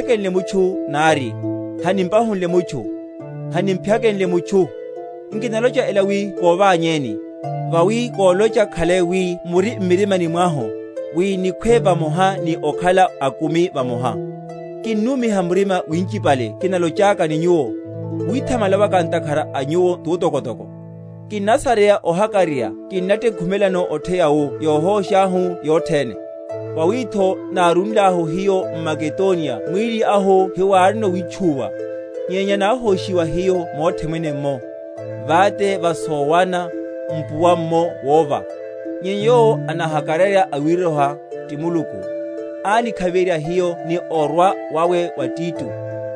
Nivaheni epuro; hanimutchekenle mutchu nari, hanimpahunle mutchu, hanimphyakenle mutchu. Nkinalocha ela wi kovanyeni: vawi kolocha khalai wi muri m’mirima mwahu, wi nikhwe vamoha ni okhala akumi vamoha. Kinnumiha murima winchipale kinalochaka ni nyuwo, withamala waka ntakhara a nyuwo tutokotoko; kinnasareya ohakararya, kinnatekhumelano otheya mu yohósháhu yothene. Vawitho nárúlahu hiyo m’Makedoniya mwíli ahu hiwárino witchuwa, nyenya náhóshiwa hiyo mothene’mmo; vate va sowana, mpuwa’mmo wova. Nyenya Yowo anahakararya awiroha, ti Muluku, ánikhaviherya hiyo ni orwa wawe wa Tito: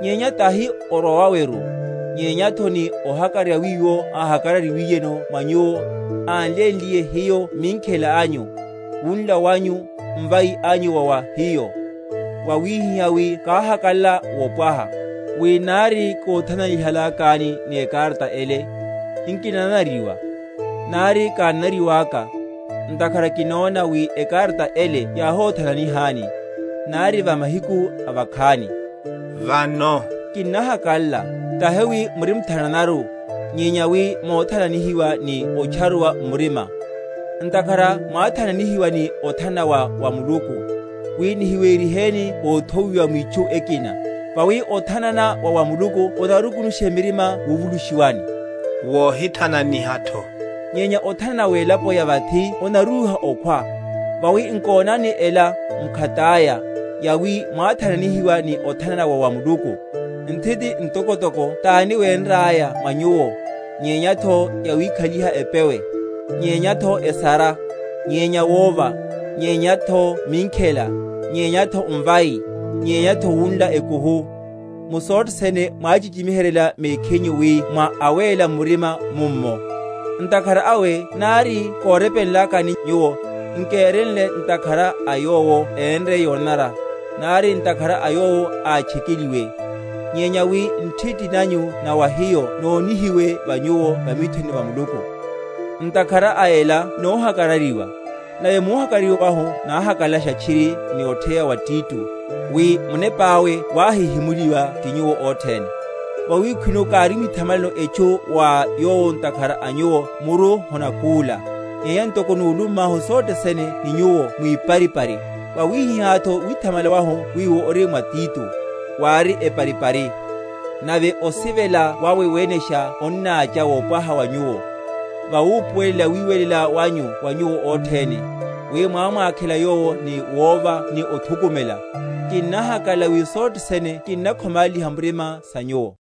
nyenya tahi ni orwa waweru, nyenyatho ni ohakararya wiwo áhakararyihiwiyeno mwa nyuwo, ánlénliye hiyo minkhela anyu, wunla wanyu, mvai anyu wa wa hiyo; wawihihá wi káhakalala wopwaha. Wi nari kóthananihalakani ni ekarata ele, nkinananariwa, nari kánanariwaka; ntakhara kinona wi ekarata ele yáhóthananihani, nari va mahiku avakhani. Vano kinnahakalala, tahi wi murimthananaru, nyenya wi mothananihiwa ni otcharuwa m’murima; ntakhara mwáthananihiwa ni othanana wa wa Muluku, wi nihiweriheni óthowiwa mwitchu ekina. Vawi othanana wa wa Muluku onarukunushele mirima wuvulushiwani, wohithananihatho; nyenya othanana welapo ya vathi onarúha okhwa. Vawi, nkonani, ela mkhataya, yawi mwáthananihiwa ni othanana wa wa Muluku, nthiti ntokotoko tani wénraya mwa nyuwo, nyenyatho yawikhaliha epewe, nyenyatho esara, nyenya wova, nyenyatho minkhela, nyenyatho mvai, nyenyatho wunla ekuhu! Mu sothe sene mwáhichichimiheryela mekhinyu wi mwa awéla murima mummo. Ntakhara awe nari kórepenlakani nyuwo, nkérenle ntakhara a yowo énre yonanara, nari ntakhara a yowo átchekeliwe, nyenya wi nthiti nanyu na wa hiyo nonihiwe wa nyuwo va mithoni va Muluku. Ntakhara a ela nóhakararyiwa; nave múhakararyiwa wahu náhakalalasha tchiri ni otheya wa Tito, wi munepáwe wáhihimuliwa ti nyuwo othene. Vawi khwino kárimwithamalano etchu wa yowo ntakhara a nyuwo muru honakúla; nyenya ntoko núlummahu sothe sene ni nyuwo mwiparipari, wawihihátho withamala wahu wiwo ori mwa Tito, wári eparipari. Nave osivela wawe wenesha onnácha wopwaha wa nyuwo, vawupuwelela wiwelela wanyu wa nyuwo othene, wi mwámwakhela yowo ni wova ni othukumela. Kinnahakalala wi m’sothe sene kinnakhomáliha murima sa nyuwo.